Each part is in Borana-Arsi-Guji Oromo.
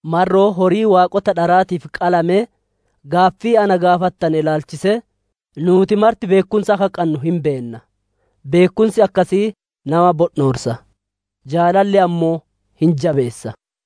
Marroo horii waaqota dharaatiif qalamee gaaffii na gaafattane ilaalchisee: Nuuti marti beekkumsa akka qannu hin beenna. Beekkumsi akkasii nama bondhoorsa; jaalalli ammoo hin jabeessa.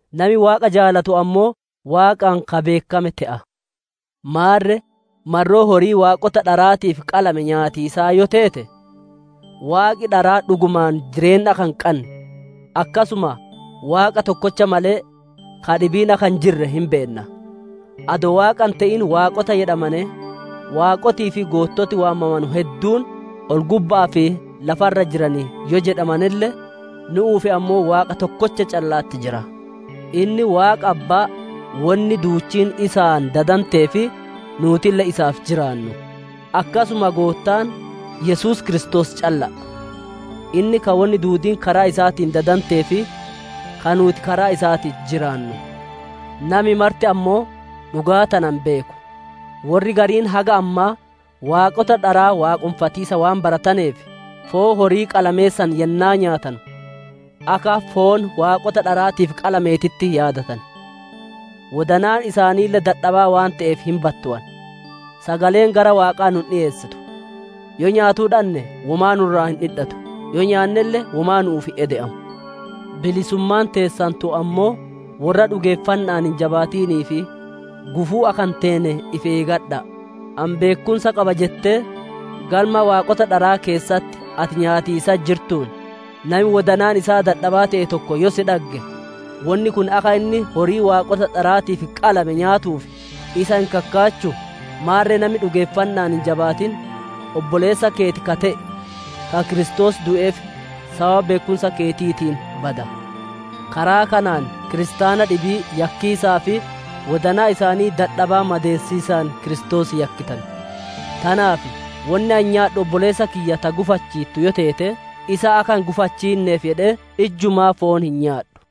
Nami Waaqa jaalatu ammoo Waaqaan ka beekkame te'a. Maarre, marroo horii waaqota dharaatiif qalame nyaatiisaa yoo teete, waaqi dharaa dhugumaan jireenna akka hin qanne, akkasuma Waaqa tokkocha malee ka dhibiin akka hin jirre hin beenna. Adoo Waaqa hin te'in waaqota jedhamanee, waaqotii fi goottoti waamamanu hedduun ol-gubba'aa fi lafa irra jiran yoo jedhamanelle, nu'uuf ammoo Waaqa tokkocha calla'atti jira. Inni Waaqa Abbaa wonni duuchiin isaan dadantee fi nuutille isaaf jiraannu; akkasuma Goottaan, Yesuus Kiristoos calla'a. Inni ka wonni duudiin karaa isaatiin dadantee fi ka nuuti karaa isaatiin jiraannu. Nami marti ammoo dhugaa tana hin beeku. Worri gariin haga ammaa waaqota dharaa waaqonfatiisa waan barataneef, foon horii qalamee san yennaa nyaatanu, akka foon waaqota dharaatiif qalameetitti yaadatan; wodanaan isaaniille dadhabaa waan te'eef hin battowan. Sagaleen gara Waaqaa nu hin dhiyeessitu; yoo nyaatuu dhanne womaa nu irraa hin dhidhatu; yoo nyaannelle womaa nu'uuf hin ede'amu. Bilisummaan teessan tun ammoo, worra dhugeeffanna'aan hin jabaatiniif gufuu akka hin teene ifi eegadha'a. Ani beekkumsa qaba jettee galma waaqota dharaa keessatti ati nyaatiisatti jirtuun, nami wodanaan isaa dadhabaa te'e tokko yoo si dhagge, wonni kun akka inni horii waaqota dharaatiif qalame nyaatuuf isa hin kakkaachuu? Maarre nami dhugeeffanna'aan hin jabaatin, obboleessa keeti ka te'e, ka Kiristoos du'eef sababa beekkumsa keetiitiin bada. Karaa kanaan kiristaana dhibii yakkiisaa fi wodanaa isaanii dadhaba madeessiisaan Kiristoos yakkitan. Tanaaf wonni ani nyaadhu obboleessa kiyya ta gufaachiittu yoo teete, isa akka hin gufachiinneef jedhee ijjumaa foon hin nyaadhu.